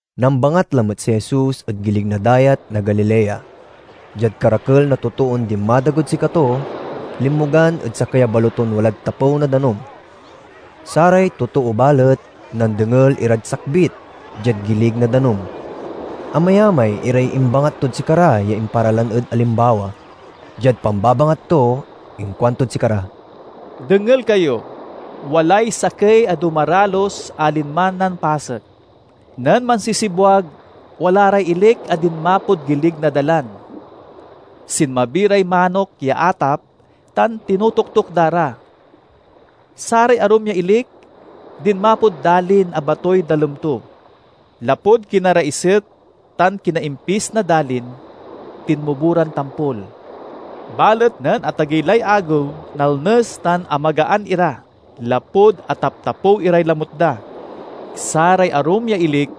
Nambangat lamet si Jesus ed gilig na Dayat na Galilea. Diad karakel na totoon dinmadagod sikato, linmogan ed sakey a baloton walad tapew na danum. Saray totoo balet, nandengel irad sakbit, diad gilig na danum. Amayamay iray imbangat tod sikara ya imparalan ed alimbawa. Diad pambabangat to inkuantod sikara: "Dengel kayo! Walay sakey a dumaralus a linman nampasek. Nen mansisibwag, wala ray ilik a dinmapod gilig na dalan. Sinmabi ray manok ya atap tan tinotoktok da ra. Saray arum ya ilik dinmapod dalin a batoy dalem to. Lapud kinaraiset tan kinaimpis na dalin, tinmubo ran tampol. Balet nen atagey lay agew, nalnes tan amagaan ira, lapud ataptapew iray lamut da. Saray arum ya ilik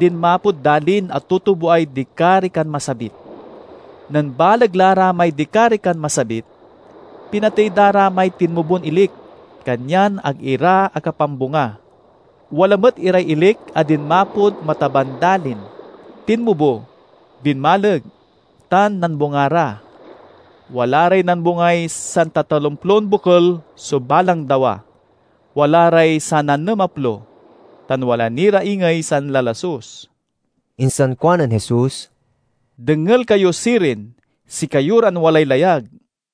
dinmapod dalin a tutuboay dikarikan masabit. Nen baleg la ra may dikarikan masabit, pinatey da ra may tinmubon ilik; kanyan ag ira akapambunga. Wala met iray ilik a dinmapod mataban dalin. Tinmubo, binmaleg, tan nambunga ra. Wala ray nambungay santatalomplon bokel so balang dawa, wala ray sananemaplo, tan wala ni ra ingey sanlasus." Insan kuanen Jesus, "Dengel kayo sirin, sikayo ran walay layag!"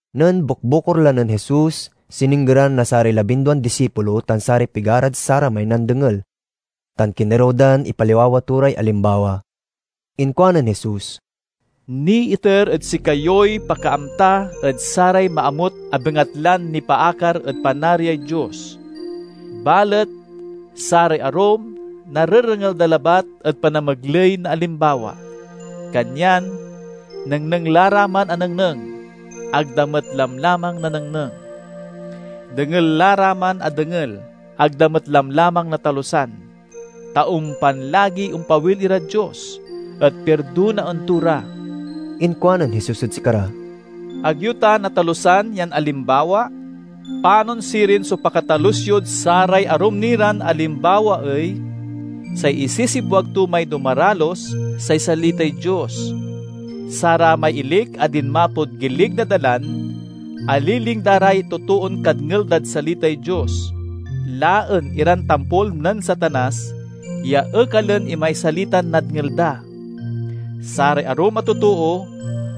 Nen bukbukor la nen Jesus sininggeran na saray labinduan disipulo tan saray pigarad saramay nandengel, tan kinerew dan ipaliwawa to ray alimbawa. Inkuanen Jesus, "Niiter ed sikayoy pakaamta ed saray maamut a bengatlan nipaakar ed Panariay Dios, balet saray arum narerengel da labat ed panamegley na alimbawa. Kanyan, 'Nengneng la ra man a nengneng, ag da met lamlamang nanengneng; dengel la ra man a dengel, ag da met lamlamang natalusan; ta ompan lagi ompawil irad Dios, et pirdonaen to ra.'" Inkuanen Jesus ed sikara: "Ag yo ta natalusan yan alimbawa? Panon sirin so pakatalus yod saray arum ni ran alimbawa ey? Say isisibwag to may dumaralus say salitay Dios. Saramay ilik a dinmapod gilig na dalan aliling da ray totoon kadngel dad salitay Dios, laen iran tampol nen Satanas ya ekalen imay salitan nadngel da. Saray arum a totoo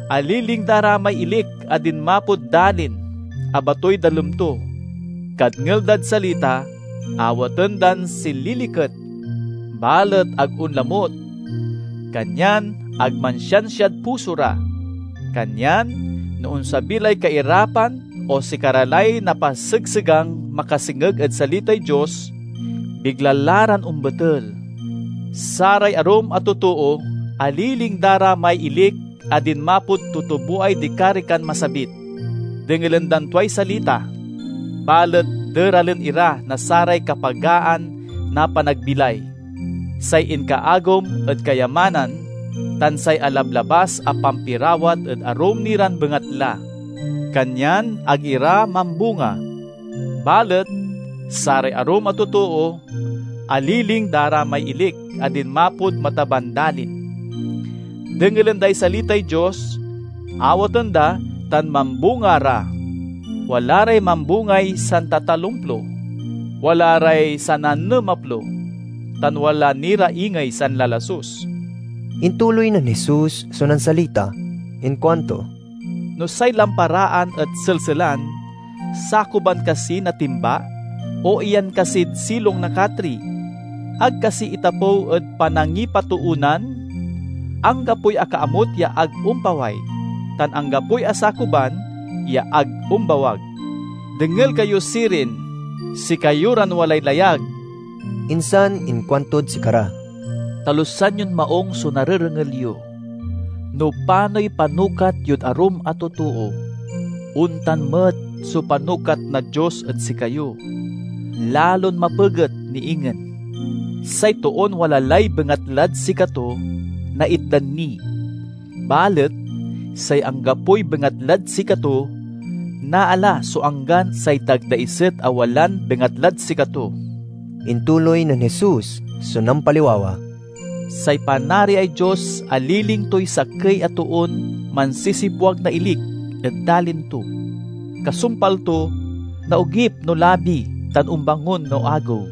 aliling da ray may ilik a dinmapod dalin a batoy dalem to. Kadngel dad salita, awaten dan sililiket. Balet ag onlamut; kanyan ag mansiansiad puso ra. Kanyan no onsabi lay kairapan o sikara lay napasegsegang makasengeg ed salitay Dios, bigla la ran ombetel. Saray arum a totoo aliling da ra may ilik a dinmapod tutuboay dikarikan masabit. Dengelen dan tuay salita, balet deralen ira na saray kapagaan na panagbilay, say inkaagom ed kayamanan, tan say alablabas a pampirawat ed arum ni ran bengatla; kanyan ag ira mambunga. Balet saray arum a totoo aliling da ra may ilik a dinmapod mataban dalin. Dengelen day salitay Dios, awaten da tan mambunga ra. Wala ray mambungay santatalomplo, wala ray sananemaplo, tan wala ni ra ingey sanlalasus." Intuloy nen Jesus so nansalita. Inkuanto, "No say lamparaan et selselan, sakuban kasi na timba o iyan kasid silong na katri? Ag kasi itapew ed panangipatoonan? Anggapoy akaamut ya ag ompaway, tan anggapoy asakuban ya ag ombawag. Dengel kayo sirin, sikayo ran walay layag!" Insan inkuantod sikara, "Talusan yon maung so narerengel yo. No panoy panukat yod arum a totoo, ontan met so panukat na Dios ed sikayo—lalon mapeget ni ingen. Say toon wala lay bengatlad sikato, naitdan ni; balet say anggapoy bengatlad sikato, naala so anggan say dagdaiset a walan bengatlad sikato." Intuloy nen Jesus so nampaliwawa: "Say Panariay Dios aliling toy sakey a toon mansisibwag na ilik ed dalin to. Kasumpal to, naogip no labi tan ombangon no agew.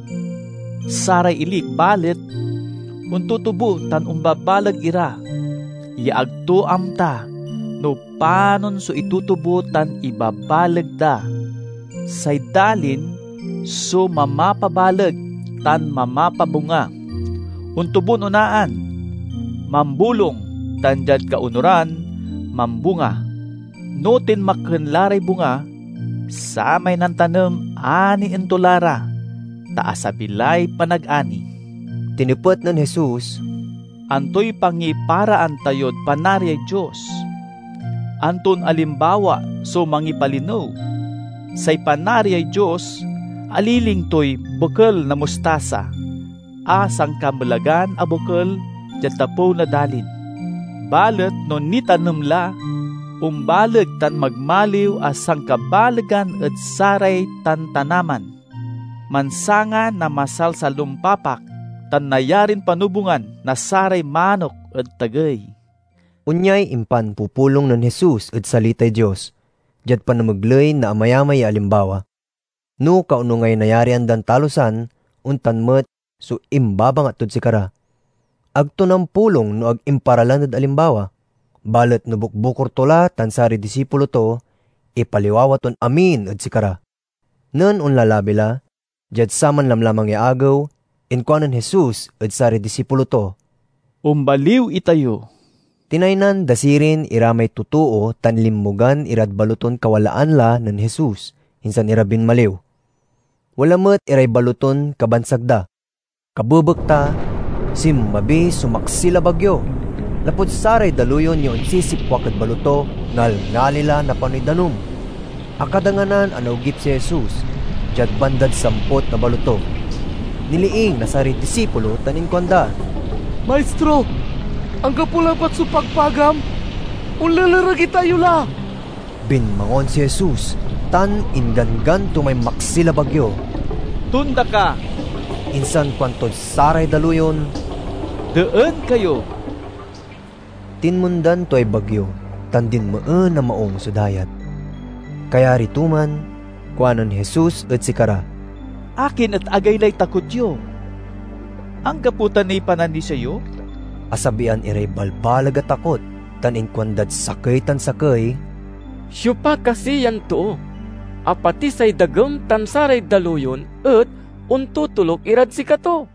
Saray ilik balet, ontutubo tan ombabaleg ira, ya ag to amta no panon so itutubo tan ibabaleg da. Say dalin so mamapabaleg tan mamapabunga: ontubon onaan, mambolung, tan diad kaonuran, mambunga. No tinmakken la ray bunga, samay nantanem anien to la ra, ta asabi lay panagani." Tinepet nen Jesus, "Antoy pangiparaan tayod Panariay Dios? Anton alimbawa so mangipalinew? Say Panariay Dios aliling toy bokel na mustasa, a sankamelagan a bokel diad tapew na dalin. Balet no nitanem la, ombaleg tan magmaliw a sankabalegan ed saray tantanaman. Mansanga na masalsalompapak, tan nayarin panobungan na saray manok ed tagey." Onyay impanpupulong nen Jesus ed salitay Dios, diad panamegley na amayamay ya alimbawa. No kaonungay nayarian dan talusan, ontan met so imbabangat tod sikara. Ag to nampulong no ag imparalan ed alimbawa. Balet no bukbukor to la tan saray disipulo to, ipaliwawa ton amin ed sikara. Nen onlalabi la, diad saman lamlamang ya agew, inkuanen Jesus ed saray disipulo to, "Ombaliw itayo." Tinaynan da sirin ira may totoo tan linmogan irad baloton kawalaan la nen Jesus, insan ira binmaliw. Wala met iray baloton kabansag da. Kabebekta, sinmabi so maksil a bagyo. Lapud saray daluyon ya onsisipwak ed baloto, ngalngali la napanoy danum. Akadanganan a naogip si Jesus, diad bandad samput na baloto. Niliing na saray disipulo tan inkuanda, "Maistro, anggapo labat so pagpagam? Onlelereg itayo la!" Binmangon si Jesus tan ingganggan to may maksil a bagyo, "Tonda ka!" Insan kuantod saray daluyon, "Deen kayo!" Tinmondan tuay bagyo tan dinmeen a maung so dayat. Kayari to man, kuanen Jesus ed sikara, "Akin et agaylay takot yo? Anggapo ta niy pananisia yo?" Asabian iray balbaleg a takot tan inkuandad sakey tan sakey, "Siopa kasi yan too, a pati say dagem tan saray daluyon et ontotoluk irad sikato?"